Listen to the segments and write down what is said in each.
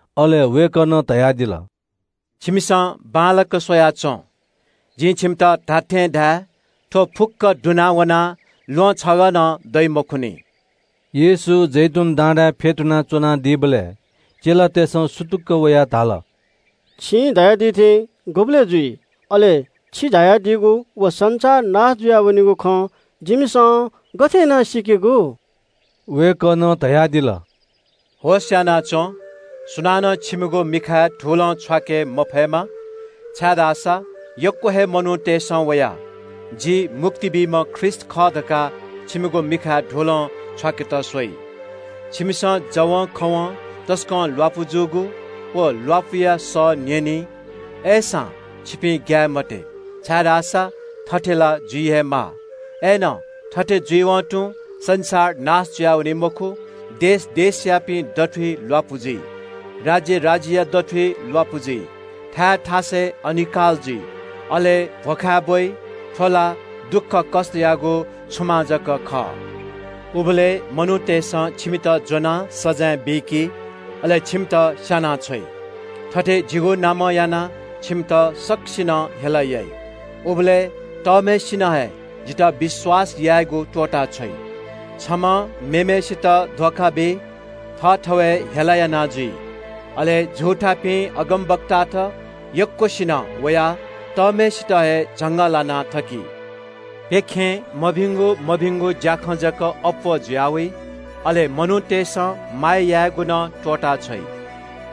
अले वय्‌कलं धयादिल – “बांलाक स्‍वयाच्‍वँ। जिं छिमित खःगु खँ धाये – थ्‍व फुक्‍क दुना वनाः ल्‍वहं छगः नं दइ मखुत।” येशू जैतून डाँडाय् फ्‍यतुना च्‍वनादीबलय् चेलातय्‌सं सुतुक्‍क वयाः धाल – “छिं धयादी थें गुबलय् जुइ? अले छि झायादीगु व संसार नाश जुया वनीगु खँ जिमिसं गथे याना सीकेगु?” वय्‌कलं धयादिल – “होश‍यानाच्‍वँ, सुनानं छिमिगु मिखाय् धुलं छ्वाके मफयेमा। छाय्‌धाःसा यक्‍व हे मनूतय्‌सं वयाः – ‘जि मुक्ति बीम्‍ह ख्रीष्‍ट खः’ धकाः छिमिगु मिखाय् धुलं छ्वाकेत स्‍वइ। छिमिसं जवंखवं तसकं ल्‍वापु जूगु व ल्‍वापुया सः ताइ। अय्‌सां छिपिं ग्‍याये मते, छाय्‌धाःसा थथे ला जुइ हे माः। अय्‌नं थथे जुइवं तुं संसार नाश जुयावनी मखु। देश देशयापिनि दथुइ ल्‍वापु जुइ। राज्‍य राज्‍यया दथुइ ल्‍वापु जुइ। थाय् थासय् अनिकाल जुइ, अले भ्‍वखाय् ब्‍वइ। थ्‍व ला दुःखकष्‍टयागु छुमां जक खः।” “उबलय् मनूतय्‌सं छिमित ज्‍वनाः सजाँय बीकी, अले छिमित स्‍यानाछ्वइ। थथे जिगु नामं यानाः छिमित सकसिनं हेला याइ। उबलय् तःम्‍हय्‌सिनं हे जितः विश्‍वास यायेगु त्‍वःताछ्वइ। छम्‍हं मेम्‍हय्‌सित धोखा बी, थःथवय् हेला याना जुइ। अले फताहा अगमवक्तात यक्‍वसिनं वयाः तःम्‍हय्‌सित हे झंगःलाना थकी। प्‍यखें मभिंगु मभिंगु ज्‍याखँ जक अप्‍वः जुया वइ, अले मनूतय्‌सं माया यायेगु नं त्‍वःताछ्वइ।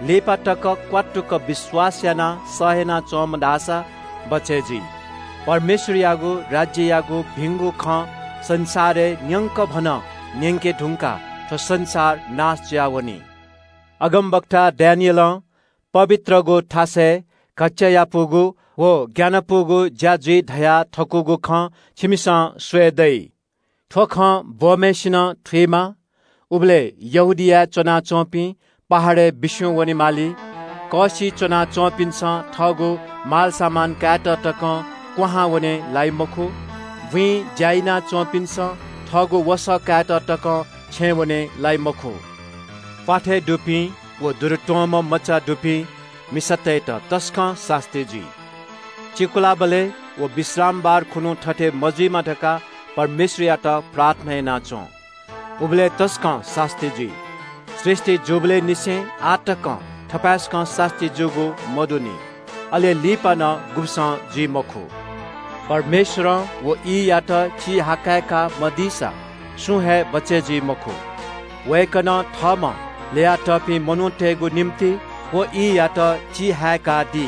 लिपा तक क्‍वात्तुक विश्‍वास यानाः सह यानाच्‍वंम्‍ह धाःसा बचय् जुइ। परमेश्‍वरयागु राज्‍ययागु भिंगु खँ संसारय् न्‍यंकभनं न्‍यंके धुंकाः थ्‍व संसार नाश जुयावनी।” “अगमवक्ता दानिएलं पवित्रगु थासय् घच्‍चायापुगु व ग्‍यानापुगु ज्‍या जुइ धयाथकूगु खँ छिमिसं स्‍वये दइ।” (थ्‍व खँ ब्‍वंम्‍हय्‌सिनं थुइमा) “उबलय् यहूदियाय् च्‍वनाच्‍वंपिं पहाडय् बिस्‍युं वनेमाली। कःसिइ च्‍वनाच्‍वंपिन्‍सं थःगु मालसामान कायेत तकं क्‍वहां वने लाइ मखु। बुँइ ज्‍या याना च्‍वंपिन्‍सं थःगु वसः कायेत तकं छेँ वने लाइ मखु। प्‍वाथय् दुपिं व दुरुत्‍वंम्‍ह मचा दुपिं मिसातय्‌त तसकं सास्‍ती जुइ। चिकुलाबलय् व विश्रामबार खुन्‍हु थथे मजुइमा धकाः परमेश्‍वरयात प्रार्थना याना च्‍वँ। उबलय् तसकं सास्‍ती जुइ। सृष्‍टि जूबलय् निसें आः तकं थपाय्‌सकं सास्‍ती जूगु मदुनि। अले लिपा नं गुब्‍सं जुइ मखु। परमेश्‍वरं व ईयात चिहाकय्‌का मदीसा सुं हे बचय् जुइ मखु। वय्‌कलं थःम्‍हं ल्‍ययातःपिं मनूतय्‌गु निंतिं व ईयात चिहाकय्‌कादी।”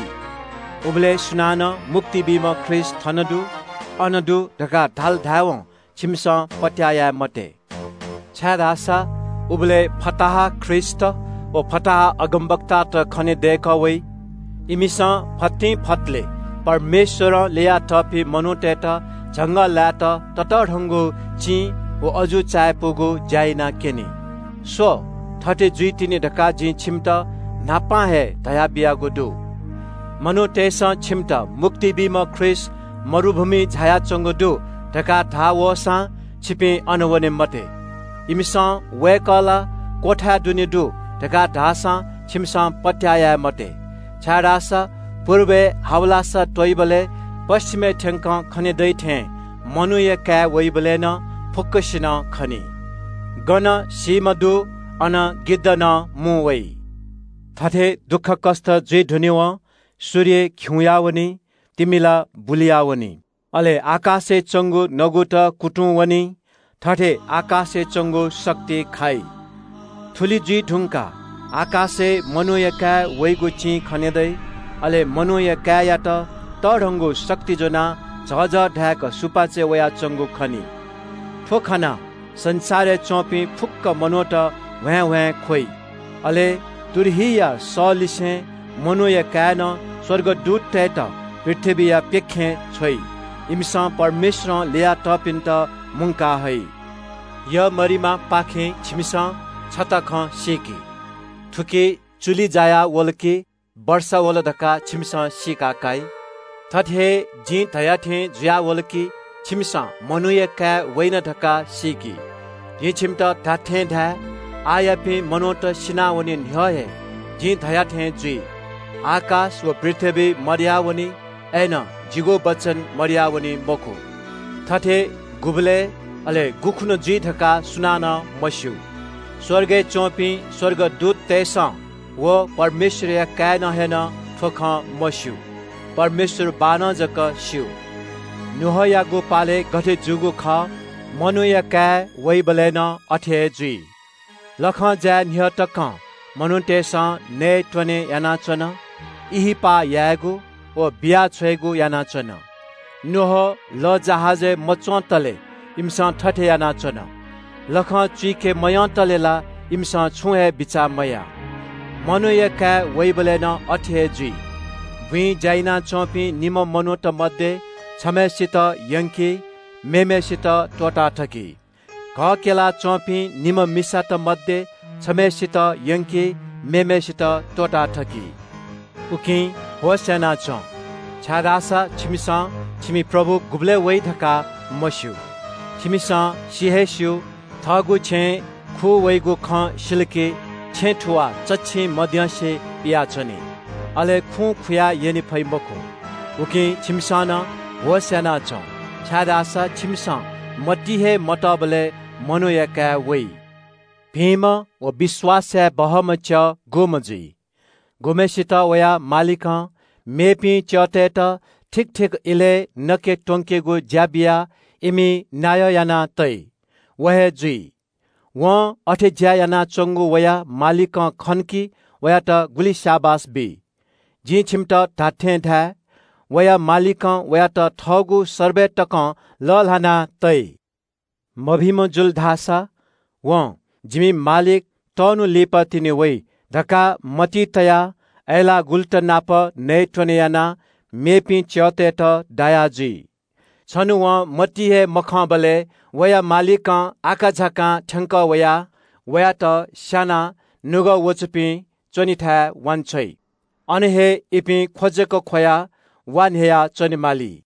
“उबलय् सुनानं ‘मुक्ति बीम्‍ह ख्रीष्‍ट थन दु, अन दु’ धकाः धाल धायेवं छिमिसं पत्‍याः याये मते। छाय्‌धाःसा उबलय् फताहा ख्रीष्‍टत व फताहा अगमवक्तात खनेदय्‌कः वइ। इमिसं फतिंफतले परमेश्‍वरं ल्‍ययातःपिं मनूतय्‌त झंगःलायेत ततःधंगु चिं व अजू चायापुगु ज्‍या यानाक्‍यनी। स्‍व, थथे जुइतिनि धकाः जिं छिमित न्‍हापां हे धयाबियागु दु।” “मनूतय्‌सं छिमित ‘मुक्ति बीम्‍ह ख्रीष्‍ट मरुभूमिइ झायाच्‍वंगु दु’ धकाः धाः वःसां छिपिं अन वने मते। इमिसं ‘वय्‌कः ला क्‍वथाय् दुने दु’ धकाः धाःसां छिमिसं पत्‍याः याये मते। छाय्‌धाःसा पुर्बय् हावलासा त्‍वइबलय् पच्‍छिमय् थ्‍यंक खने दइ थें मनूया काय् वइबलय् नं फुक्‍कसिनं खनी। गन सीम्‍ह दु अन गिद्ध नं मुं वइ।” “थथे दुःखकष्‍ट जुइ धुनेवं “‘सूर्य खिउँया वनी, तिमिला बुलुयावनी, अले आकाशय् च्‍वंगु नगुत कुतुं वनी, थथे आकाशय् च्‍वंगु शक्ति खाइ।’ “थुलि जुइ धुंकाः आकाशय् मनूया काय् वइगु चिं खने दइ। अले मनूया काय्‌यात तःधंगु शक्ति ज्‍वनाः झःझः धाय्‌क सुपाँचय् वयाच्‍वंगु खनी। थ्‍व खनाः संसारय् च्‍वंपिं फुक्‍क कुलयापिं मनूत ह्वाँय्‌ह्वाँय् ख्‍वइ। अले तुरहीया सःलिसें मनूया काय्‌नं स्‍वर्गदूततय्‌त पृथ्‍वीया प्‍यखें छ्वइ। इमिसं परमेश्‍वरं ल्‍ययातःपिन्‍त मुंका हइ। “यःमरिमापाखें छिमिसं छता खँ सीकि। थुकी चुलि जायावल कि वर्षा वल धकाः छिमिसं सीका काइ। थुकथं जिं धया थें जुयावल कि छिमिसं मनूया काय् वइन धकाः सीकि। जिं छिमित खःगु खँ धाये – आःयापिं मनूत सिनावने न्‍ह्यः हे जिं धया थें जुइ। आकाश व पृथ्‍वी मदयावनी, अय्‌नं जिगु वचन मदयावनी मखु। “थथे गुबलय्, अले गुखुन्‍हु जुइ धकाः सुनानं मस्‍यू। स्‍वर्गय् च्‍वंपिं स्‍वर्गदूततय्‌सं व परमेश्‍वरया काय्‌नं नं थ्‍व खँ मस्‍यू। परमेश्‍वर बाःनं जक स्‍यू। “नोआयागु पालय् गथे जूगु खः मनूया काय् वइबलय् नं अथे हे जुइ। लखं जाये न्‍ह्यः तकं मनूतय्‌सं नयेत्‍वने यानाच्‍वन, ब्‍याहा यायेगु व बिया छ्वयेगु यानाच्‍वन। नोआ लःजहाजय् मच्‍वंतले इमिसं थथे यानाच्‍वन। लखं चुइके मयंतले ला इमिसं छुं हे बिचाः मयाः। मनूया काय् वइबलय् नं अथे हे जुइ। “बुँइ ज्‍या यानाच्‍वंपिं निम्‍ह मनूत मध्‍ये छम्‍हय्‌सित यंकी, मेम्‍हय्‌सित त्‍वःताथकी। घः क्‍यला च्‍वंपिं निम्‍ह मिसात मध्‍ये छम्‍हय्‌सित यंकी, मेम्‍हय्‌सित त्‍वःताथकी। “उकिं होश‍यानाच्‍वँ, छाय्‌धाःसा छिमिसं छिमि प्रभु गुबलय् वइ धकाः मस्‍यू। छिमिसं सि हे स्‍यू – थःगु छेँय् खुँ वइगु खँ सिल कि छेँ थुवाः चच्‍छिं मद्यंसे पियाच्‍वनी। अले खुं खुया यने फइ मखु। उकिं छिमिसं नं होश‍यानाच्‍वँ, छाय्‌धाःसा छिमिसं मतिइ हे मतःबलय् मनूया काय् वइ। “भिंम्‍ह व विश्‍वास याये बहःम्‍ह च्‍यः सु जुइ? सुयात वया मालिकं मेपिं च्‍यःतय्‌त ठीक ठीक इलय् नके त्‍वंकेगु ज्‍या बियाः इमि नायः याना तइ, व हे जुइ। वं अथे ज्‍या यानाच्‍वंगु खनाः मालिकं वयात गुलि स्‍याबास बी। जिं छिमित खःगु खँ धाये – वया मालिकं वयात थःगु सर्बय तकं लःल्‍हाना तइ। मभिंम्‍ह जुल धाःसा वं – ‘जिमि मालिक तःन्‍हु लिपातिनि वइ’ धकाः मतिइ तयाः अय्‌लाःगुलुत नाप नयेत्‍वने यानाः मेपिं च्‍यःतय्‌त दाया जुइ। छन्‍हु वं मतिइ हे मखंबलय् वया मालिकं आकाझाकां थ्‍यंकः वयाः वयात स्‍यानाः निपाः ख्‍वाःपाः दुपिं च्‍वनी थाय् वांछ्वइ। अन हे इपिं ख्‍व जक ख्‍वयाः वा न्‍ह्ययाः च्‍वनेमाली।